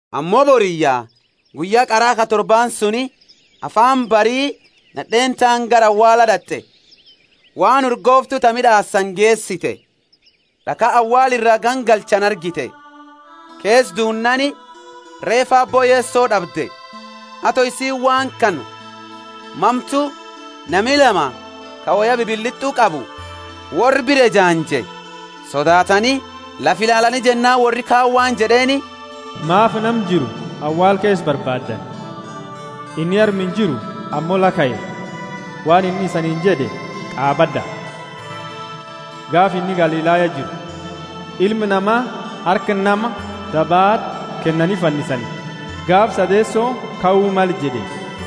Ammo boriyya guyya qara ka torbaani suni, afaani bari, nad'eeni taani gara awaala d'at'e, waan urgooftu ta mid'aasani geesite. D'akha awaala ira gangalchani argite, keesa duunnaani reefa Aabbo Yeso d'abde. Ato isiini waan kana mamtu, nami lama, ka woya bibilit'u qabu, worra bira ejaanje. Sodaatani, lafa ilaalani jennaani worri kaani waan jed'eeni, Maafi nama jiru awaala keesa barbaaddani? Inni arma injiru, ammo la kae. Waan inni isaniini jed'e qaabad'a, gaafa inni Galilaya jiru: Ilma Nama harka nama dabati kennani fannisani, gaafa sadeeso kau male jed'e.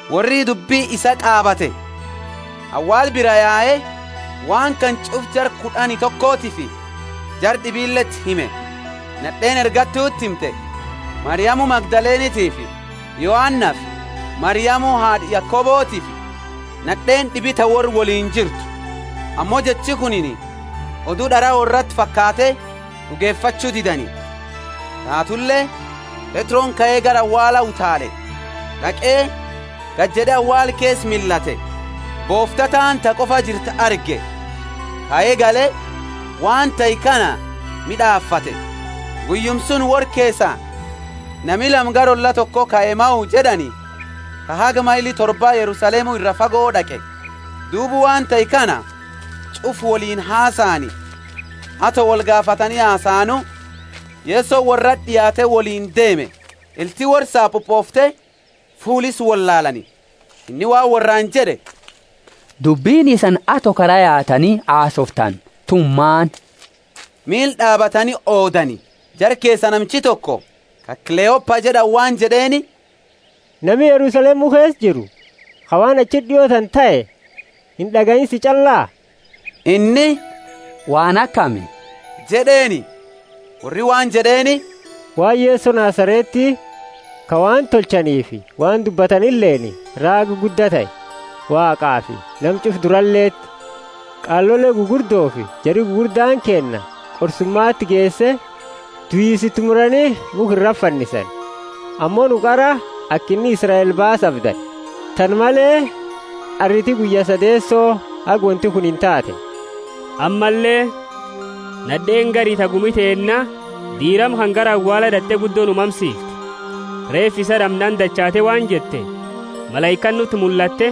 Worri dubbi isaa qaabate, awaala biraa yae, waan kana ch'ufu jara kud'ani tokotiifi jara d'ibileti hime. Nad'eeni ergattuti himte Mariamu Magdalenefi Yoanafi Mariamu haad'a Yakobotifi nad'eeni d'ibi ta worra woliini jirtu. Ammo jechi kunini odu d'araa worraati fakaate d'ugefachu didani. Taatule Petroni kae gara awaala utaale, d'aqe gajed'e awaala keesa millate, boofta taani ta koba jirtu arge, kae gale, waan tahe kana maadefate. Guyyuma suni worra keesa nami lama gara olla toko ka Emmao jed'ani, ka haga maili torba Yerusalemu iraa fago, d'aqe. Duuba waan tahe kana ch'ufa woliini hasaani. Ato wolgaafatani hasaanu, Yesoni worrati d'iaate woliini deeme. Ilti worra sapupoofte, fuula isa wollaalaani. Inni waan worraani jed'e, Dubbini isani ato kara yaatani hasooftanu tuni maani? Miila d'aabatani oodani. Jara keesa namichi toko, ka Kleopa jed'ani, waan jed'eeni, Nami Yerusalemu keesa jiru, ka waan achiti d'io tana tahe ind'agayiini sii ch'alla? Inni, Waan akami? jed'eeni. Worri waan jed'eeni, Waan Yeso Nazareti, ka waan tolchanifi waan dubbatanileeni raaga gudda tahe Waaqafi nama ch'ufa duraleti. Qaalole gugurdofi jari gugurdaani keenna, qorsumati geese, duisa itimurani mukha irati fannisani. Ammo nu qara aka inni Israeli baasu abdanne. Tana male, arriti guyya sadeeso haga wonti kunini taate. Ammalle, nad'eeni gari ta gumi teenna diirama kana gara awaala d'at'e guddo nu mamsiifte. Reefa isaa d'amnaani dachaate waan jette, Malaikaani nuti mullatte,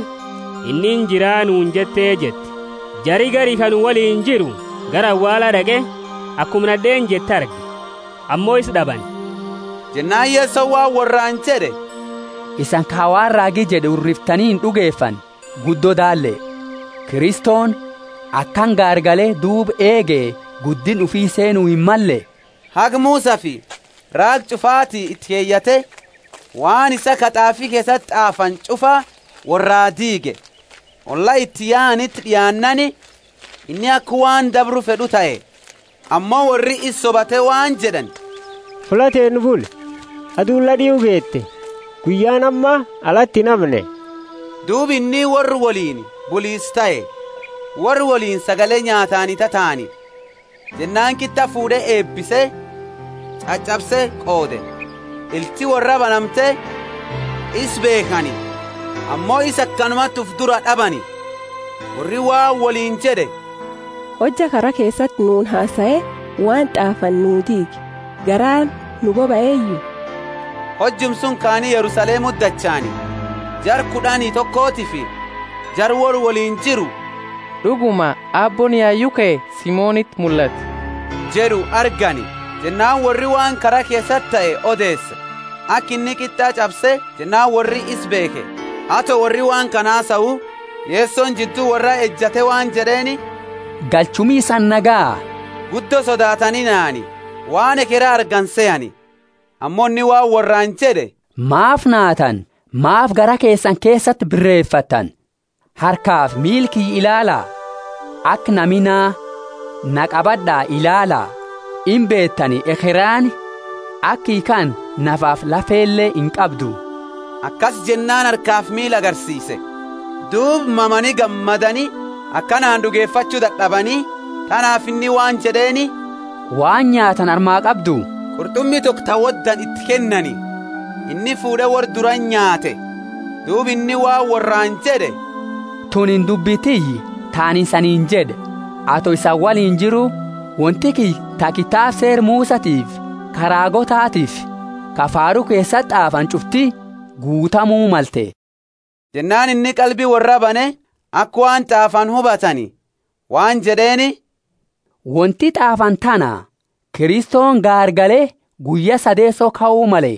Inni injira nuuni jette, jette. Jari gari ka nu woliini jiru gara awaala d'aqe, akuma nad'eeni jette arge, ammo isa d'abani. Jennaani Yesoni waan worraani jed'e, Isani ka waan raagi jed'e hurriftani ind'ugefanne guddo daalle! Kristoni akana gaargale duuba eege guddinna ufi seenu himmalle? Haga Musafi raagi ch'ufati iti keyate, waan isaa ka t'aafi keesati t'aafani ch'ufa worraa diige. Olla iti yaaniti d'iaannaani, inni aka waan dabru fed'u tahe; ammo worri isa sobate waan jed'ani, Fulla teenna buli, aduuni la d'iu geete, guyyaani amma alati inhamne. Duuba inni worra woliini bulisa tahe. Worra woliini sagale nyaatani tataani, jennaani qit'a fuud'e eebise, ch'ach'abse qoode. Ilti worraa banamte isa beekhani, ammo isa akanumati ufi duraa d'abani. Worri waan woliini jed'e, Hojja kara keesati nuuni hasae waan t'aafani nu diige, garaani nu bobaeyu? Hojuma suni kaani Yerusalemuti dachaani, jara kud'ani tokofi jara worra woliini jiru ka wolti woldae d'uguma Aabbooni yayu kae, Simoniti mullate jed'u argani. Jennaani worri waan kara keesati tahe odeese, aka inni qit'a ch'abse jennaani worri isa beekhe. Ato worri waan kana hasau, Yesoni jiddu worraa ejate waan jed'eeni, Galchuumi isani nagaya? Guddo sodaatani nahani, waan ekhera argani sehani. Ammo inni waan worraani jed'e, Maafi naatani? Maafi garaa keesani keesati birefattani? Harkafi miila kiyya ilaala, aka nami naa. Naa qabad'a ilaala, imbeetani ekheraani aka kiyya kana nafafi lafele inqabdu. Akasi jennaani harkafi miila agarsiise. Duuba mamani gammadani akanaani d'ugefachu dad'abani, tanaafi inni waan jed'eeni, waan nyaatani arma qabdu. Qurt'umi diqo ta wodani iti kennani, inni fuud'e worra durati nyaate. Duuba inni waan worraani jed'e, Tunini dubbi tiyya ta anini isaniini jed'e, ato isani woliini jiru; wonti ti kiyya ta kitaaba Seera Musatifi ka raagootatiifi ka Faaru keesati t'aafani ch'ufti guutamu malte. Jennaani inni qalbi worraa bane, aka waan t'aafani hubatani, waan jed'eeni, wonti t'aafani, tana; Kristoni gaargale guyya sadeeso kau male,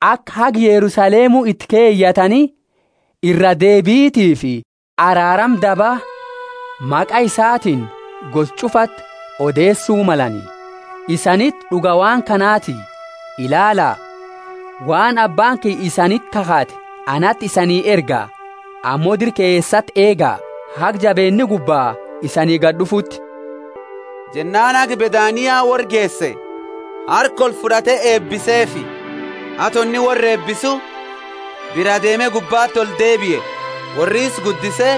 aka haga Yerusalemu iti keyatani iraa deebitifi araarama daba maqa isatiini gosa ch'ufati odeesu malani. Isaniti d'uga waan kanati. Ilaala, waan Abbaani kiyya isaniti kakhate anati isanii erga, ammo dira keesati eega, haga jabeenni gubba isanii gad'ufuti. Jennaani haga Bethania worra geese, harka olfud'ate eebiseefi. Ato inni worra eebisu, biraa deeme gubbati oldeebie. Worri isa guddise,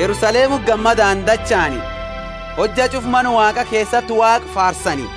Yerusalemuti gammadaani dachaani, hojja ch'ufa Mana Waaqa keesati Waaqa faarsani.